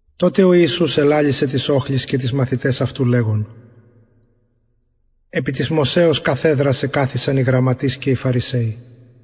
τοτε ο ιησους ελαλησεν τοις οχλοις και τοις μαθηταις αυτου λεγων επι της μωσεως καθεδρας εκαθισαν οι γραμματεις και οι φαρισαιοι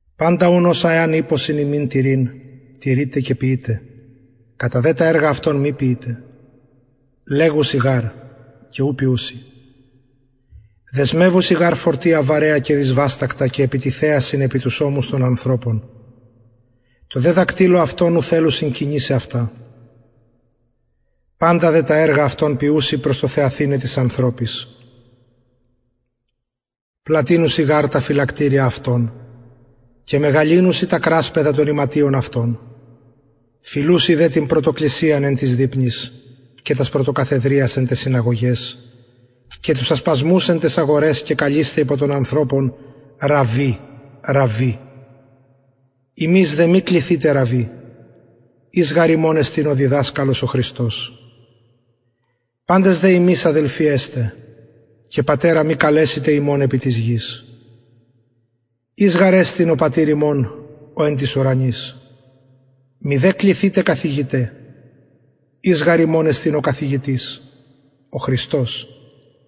παντα ουν οσα εαν ειπωσιν υμιν τηρειν τηρειτε και ποιειτε κατα δε τα εργα αυτων μη ποιειτε λεγουσιν γαρ και ου ποιουσιν δεσμευουσιν γαρ φορτια βαρεα και δυσβαστακτα και επιτιθεασιν επι τους ωμους των ανθρωπων τω δε δακτυλω αυτων ου θελουσιν κινησαι αυτα παντα δε τα εργα αυτων ποιουσιν προς το θεαθηναι τοις ανθρωποις πλατυνουσιν δε τα φυλακτηρια αυτων και μεγαλυνουσιν τα κρασπεδα των ιματιων αυτων φιλουσιν τε την πρωτοκλισιαν εν τοις δειπνοις και τας πρωτοκαθεδριας εν ταις συναγωγαις και τους ασπασμους εν ταις αγοραις και καλεισθαι υπο των ανθρωπων ραββι ραββι υμεις δε μη κληθητε ραββι εις γαρ εστιν υμων ο καθηγητης ο χριστος παντες δε υμεις αδελφοι εστε και πατερα μη καλεσητε υμων επι της γης εις γαρ εστιν ο πατηρ υμων ο εν τοις ουρανοις μηδε κληθητε καθηγηται εις γαρ υμων εστιν ο καθηγητης ο χριστος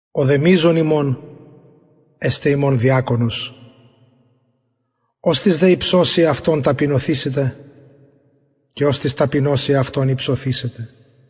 ο δε μειζων υμων εσται υμων διακονος οστις δε υψωσει εαυτον ταπεινωθησεται και οστις ταπεινωσει εαυτον υψωθησεται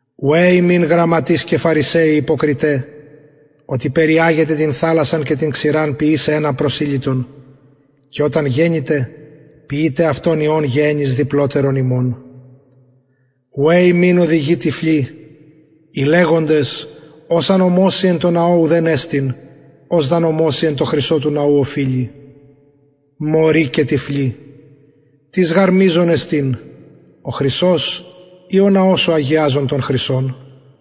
ουαι υμιν γραμματεις και φαρισαιοι υποκριται οτι περιαγετε την θαλασσαν και την ξηραν ποιησαι ενα προσηλυτον και οταν γενηται ποιειτε αυτον υιον γεεννης διπλοτερον υμων ουαι υμιν οδηγοι τυφλοι οι λεγοντες ος αν ομοση εν τω ναω ουδεν εστιν ος δ αν ομοση εν τω χρυσω του ναου οφειλει μωροι και τυφλοι τις γαρ μειζων εστιν ο χρυσος η ο ναος ο αγιαζων τον χρυσον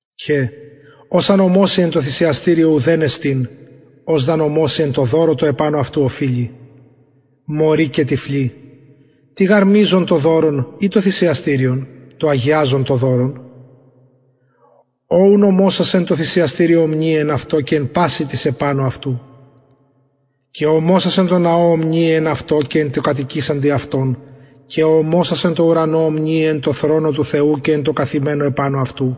και ος εαν ομοση εν τω θυσιαστηριω ουδεν εστιν ος δ αν ομοση εν τω δωρω τω επανω αυτου οφειλει μωροι και τυφλοι τι γαρ μειζον το δωρον η το θυσιαστηριον το αγιαζον το δωρον ο ουν ομοσας εν τω θυσιαστηριω ομνυει εν αυτω και εν πασιν τοις επανω αυτου και ο ομοσας εν τω ναω ομνυει εν αυτω και εν τω κατοικησαντι αυτον και ο ομοσας εν τω ουρανω ομνυει εν τω θρονω του θεου και εν τω καθημενω επανω αυτου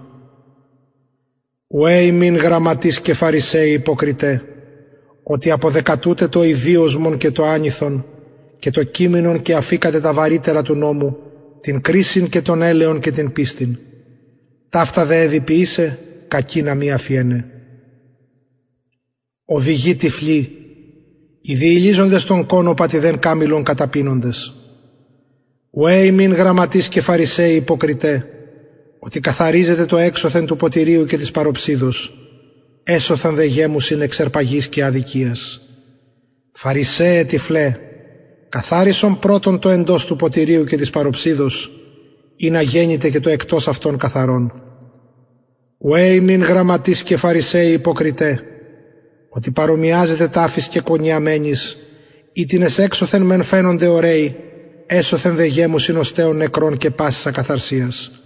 ουαι υμιν γραμματεις και φαρισαιοι υποκριται οτι αποδεκατουτε το ηδυοσμον και το ανηθον και το κυμινον και αφηκατε τα βαρυτερα του νομου την κρισιν και τον ελεον και την πιστιν ταυτα εδει ποιησαι κακεινα μη αφιεναι οδηγοι τυφλοι οι διυλιζοντες τον κωνωπα την δε καμηλον καταπινοντες ουαι υμιν γραμματεις και φαρισαιοι υποκριται οτι καθαριζετε το εξωθεν του ποτηριου και της παροψιδος εσωθεν δε γεμουσιν εξ αρπαγης και αδικιας φαρισαιε τυφλε καθαρισον πρωτον το εντος του ποτηριου και της παροψιδος ινα γενηται και το εκτος αυτων καθαρον ουαι υμιν γραμματεις και φαρισαιοι υποκριται οτι παρομοιαζετε ταφοις κεκονιαμενοις οιτινες εξωθεν μεν φαινονται ωραιοι εσωθεν δε γεμουσιν οστεων νεκρων και πασης ακαθαρσιας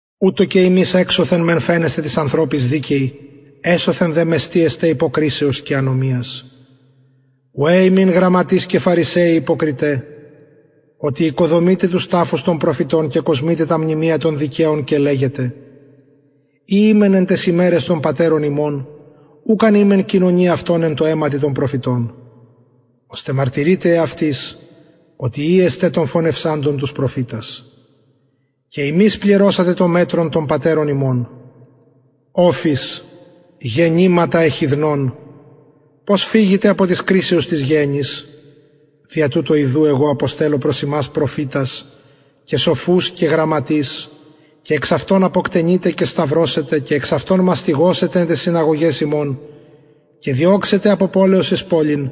ουτως και υμεις εξωθεν μεν φαινεσθε τοις ανθρωποις δικαιοι εσωθεν δε μεστοι εστε υποκρισεως και ανομιας ουαι υμιν γραμματεις και φαρισαιοι υποκριται οτι οικοδομειτε τους ταφους των προφητων και κοσμειτε τα μνημεια των δικαιων και λεγετε ει ημεν εν ταις ημεραις των πατερων ημων ουκ αν ημεν κοινωνοι αυτων εν τω αιματι των προφητων ωστε μαρτυρειτε εαυτοις οτι υιοι εστε των φονευσαντων τους προφητας και υμεις πληρωσατε το μετρον των πατερων υμων οφεις γεννηματα εχιδνων πως φυγητε απο της κρισεως της γεεννης δια τουτο ιδου εγω αποστελλω προς υμας προφητας και σοφους και γραμματεις και εξ αυτων αποκτενειτε και σταυρωσετε και εξ αυτων μαστιγωσετε εν ταις συναγωγαις υμων και διωξετε απο πολεως εις πολιν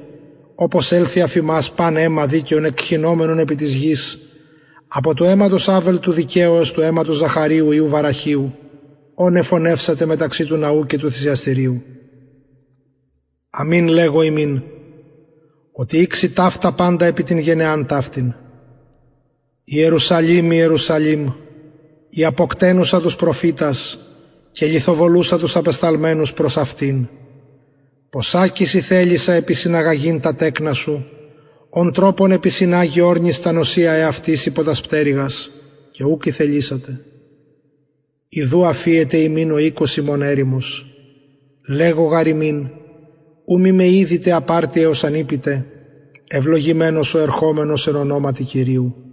οπως ελθη εφ υμας παν αιμα δικαιον εκχυνομενον επι της γης απο του αιματος αβελ του δικαιου εως του αιματος ζαχαριου υιου βαραχιου ον εφονευσατε μεταξυ του ναου και του θυσιαστηριου αμην λεγω υμιν οτι ηξει παντα ταυτα επι την γενεαν ταυτην ιερουσαλημ ιερουσαλημ η αποκτενουσα τους προφητας και λιθοβολουσα τους απεσταλμενους προς αυτην ποσακις ηθελησα επισυναγαγειν τα τεκνα σου ον τροπον επισυναγει ορνις τα νοσσια εαυτης υπο τας πτερυγας και ουκ ηθελησατε ιδου αφιεται υμιν ο οικος υμων ερημος λεγω γαρ υμιν ου μη με ιδητε απ αρτι εως αν ειπητε ευλογημενος ο ερχομενος εν ονοματι κυριου